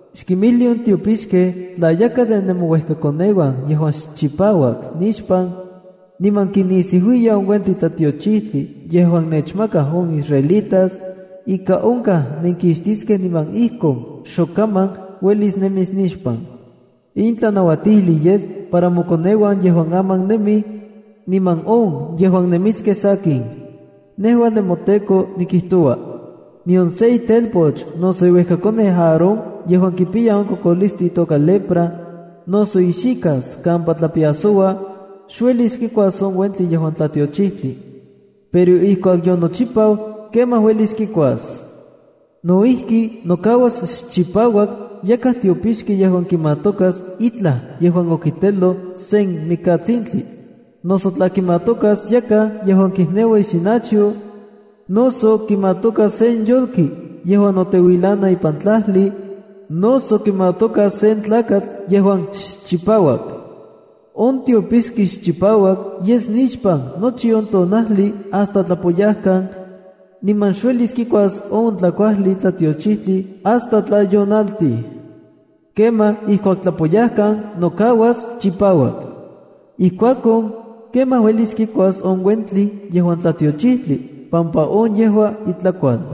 ’Xkinmijli on tiopixkej tla yakaj de nemouejkakoneuan yejuan xchipauak nixpan, niman kinisiuiya on uentli tlatiochijtli yejuan nechmakaj on israelitas, ika onkaj nenkixtiskej niman ijkon xokaman uelis nemis nixpan. In tlanautijli yes para mokoneuan yejuan aman nemij, niman no yejuan nemiskej sakin. Nejua nemoTEKO nikijtoua. ’Nion se itelpoch noso iuejkakoneu Aarón yejuan kipiya on kokolistli itoka lepra, noso ixika kampa tlapiasoua, xuelis kikuas on uentli yejuan tlatiochijtli. Pero ijkuak yonochipau, kemaj uelis kikuas. ’No ijki, nokauas xchipauak yakaj tiopixki yejuan kimatokas itlaj yejuan okiteloj sen mikatsintli, noso tla kimatokas yakaj yejuan kijneua ixinachyo, noso kimatokas sen yolki yejuan noteuilana ipan tlajli, noso kimatokas sen tlakatl yejuan xchipauak. On tiopixki xchipauak yes nixpan nochi on tonajli hasta tlapoyajkan, niman xuelis kikuas on tlakuajli tlatiochijtli hasta tla yonaltij. Kemaj ijkuak tlapoyajkan nokauas chipauak. Ijkuakon, kemaj uelis kikuas on uentli yejuan tlatiochijtli pampa on yejua itlakual.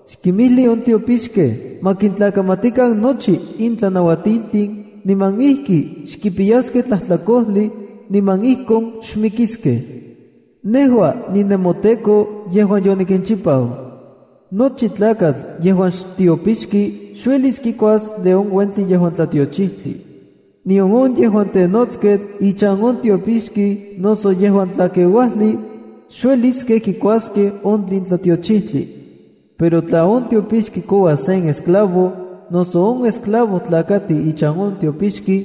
Xkinmijli on tiopixkej ma kintlakamatikan nochi in tlanauatiltin niman ijki xkipiyaskej tlajtlakojli, niman ijkon xmikiskej. Nejua ninemoTEKO yejuan yonikinchipau. ’Nochi tlakatl yejuan xtiopixki xuelis kikuas de on uentli yejuan tlatiochijtli. Nion on yejuan tenotsketl ichan on tiopixki noso yejuan tlakeuajli, xueliskej kikuaskej on tlin tlatiochijtli. Pero tla on tiopixki kouas sen esclavo, noso on esclavo tlakati ichan on tiopixki,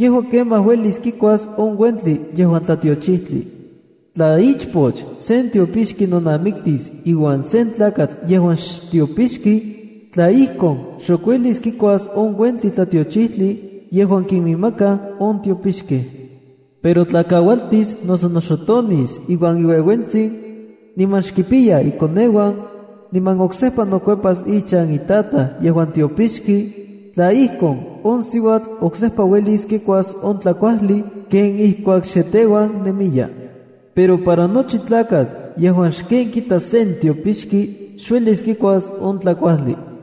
yejua kemaj uelis kikuas on uentli yejuan tlatiochijtli. Tla ichpoch sen tiopixki nonamiktis iuan sen tlakatl yejuan xtiopixki, tla ijkon, xok uelis kikuas on uentli tlatiochijtli yejuan kiminmakaj on tiopixkej. Pero tla kaualtis noso noxotonis iuan iueuentsin, niman xkimpiya ikoneuan, niman oksejpa nokuepas ichan itataj yejuan tiopixki, tla ijkon, on siuatl oksejpa uelis kikuas on tlakuajli ken ijkuak xe teuan nemiya. Pero para nochi tlakatl yejuan xken kita sen tiopixki xuelis kikuas on tlakuajli.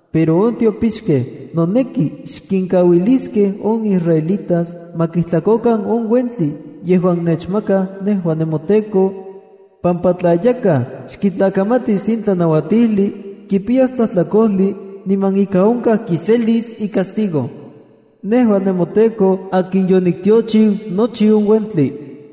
Pero on tiopixkej noneki xkinkauiliskej on israelitas ma kijtlakokan on uentli yejuan nechmakaj nejua nemoTEKO, pampa tla yakaj xkitlakamatis in tlanauatijli, kipiyas tlajtlakojli niman ika onkaj kiselis icastigo. Nejua nemoTEKO akin yoniktiochiu nochi on uentli”.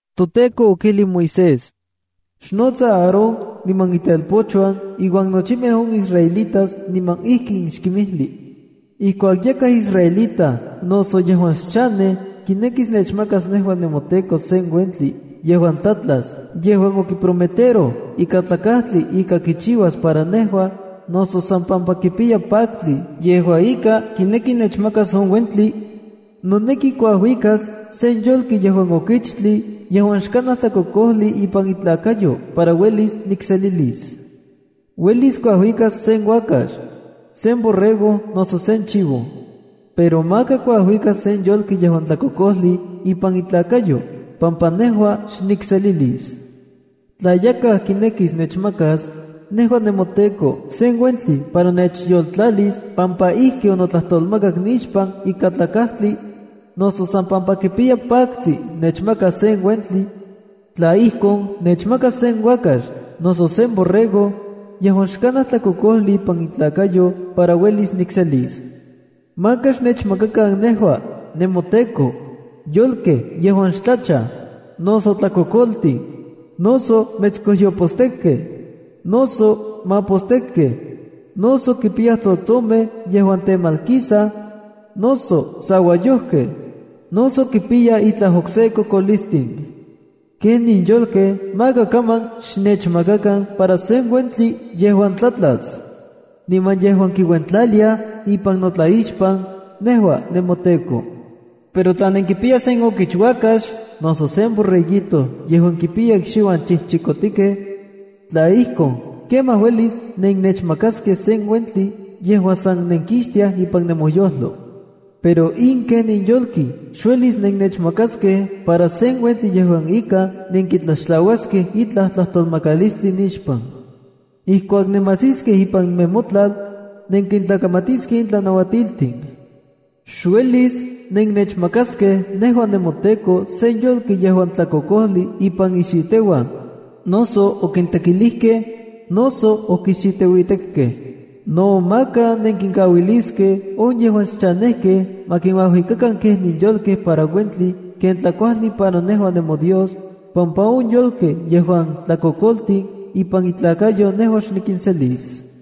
ToTEKO okijlij Moisés: “Xnotsa Aarón niman itelpochuan iuan nochimej on israelitas niman ijkin xkinmijli: Ijkuak yakaj israelita noso yejuan xchanej kinekis nechmakas nejua nemoTEKO sen uentli yejuan tlatlas yejuan okiprometeroj ikatlakajtli ika kichiuas para nejua, noso san pampa kipiya paktli yejua ika kineki nechmakas on uentli, noneki kuajuikas sen yolki yejuan okichtli yejuan xkanaj tlakokojli ipan itlakayo para uelis nikselilis. Uelis kuajuikas sen uakax, sen borrego noso sen chivo. Pero maka kuajuikas sen yolki yejuan tlakokojli ipan itlakayo, pampa nejua xnikselilis. ’Tla yakaj kinekis nechmakas, nejua nemoTEKO, sen uentli para nechyoltlalis pampa ijki onotlatolmakak nixpan ikatlakajtli, noso san pampa kipiya paktli nechmakas sen uentli, tla ijkon, nechmakas sen uakax, noso sen borrego, yejuan xkanaj tlakokojli ipan itlakayo para uelis nikselis. Maka xnechmakakan nejua, nemoTEKO, yolkej yejuan xtlachaj, noso tlakokoltin, noso metskojyopostekkej, noso mapostekkej, noso kipiyaj tsotsomej yejuan temalkisaj, noso sauayojkej, noso kipiyaj itlaj okse kokolistin. Kenin yolkej maka kaman xnechmakakan para sen uentli yejuan tlatlas, niman yejuan kiuentlaliaj ipan notlaixpan nejua nemoTEKO. Pero tla nenkipiyaj sen okichuakax, noso sen borreguito yejuan kipiya ikxiuan chijchikotikej, tla ijkon, kemaj uelis nennechmakaskej ken sen uentli yejuan san nenkixtiaj ipan nemoyojlo. Pero in kenin yolki xuelis nennechmakaskej para sen uentli yejua ika nenkitlaxtlauaskej itlaj tlajtolmakalistli nixpan. Ijkuak nemajsiskej ipan nemotlal, nenkintlakamatiskej in tlanauatiltin. Xuelis nennechmakaskej nejua nemoTEKO sen yolki yejuan tlakokojli ipan ixiteuan, noso okintekilijkej, noso okixiteuitekkej. No maka nenkinkauiliskej on yejuan xchanejkej ma kinuajuikakan kenin yolkej para uentli ken tlakuajli para nejua nemoDios, pampa on yolkej yejuan tlakokoltin ipan intlakayo nejua xnikinselis.”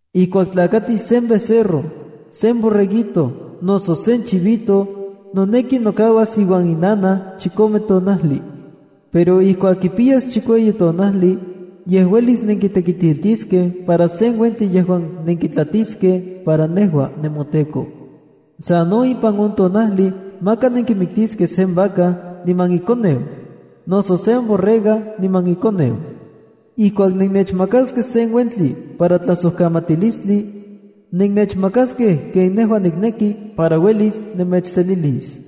“Ijkuak tlakatis sen becerro, sen borreguito, noso sen chivito, noneki nokauas iuan inanaj chikome tonajli. Pero ijkuak kipiyas chikueyi tonajli, ye uelis nenkitekitiltiskej para sen uentli yejuan nenkitlatiskej para nejua nemoTEKO. Sa no ipan on tonajli maka nenkimiktiskej sen vaca niman ikoneu, noso sen borrega niman ikoneu. Ijkuak nenechmakaskej sen uentli para tlajsojkamatilistli, nennechmakaskej ken nejua nikneki para uelis nemechselilis.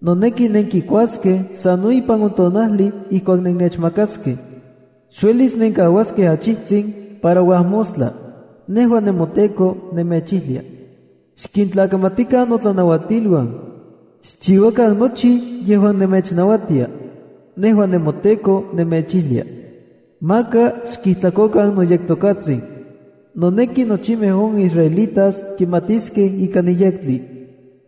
Noneki nenkikuaskej sa no ipan on tonajli ijkuak nennechmakaskej. Xuelis nenkauaskej achijtsin para uajmostla. Nejua nemoTEKO nemechijlia. ’Xkintlakamatikan notlanauatiluan. Xchiuakan nochi yejuan nemechnauatia. Nejua nemoTEKO nemechijlia. Maka xkijtlakokan noyektokatsin. Noneki nochimej on israelitas kimatiskej ika niyektli.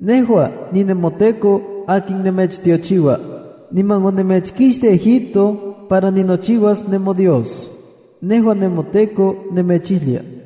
Nejua ninemoTEKO akin nemechtiochiua, niman onemechkixtij Egipto para ninochiua nemoDios. Nejua nemoTEKO nemechijlia.”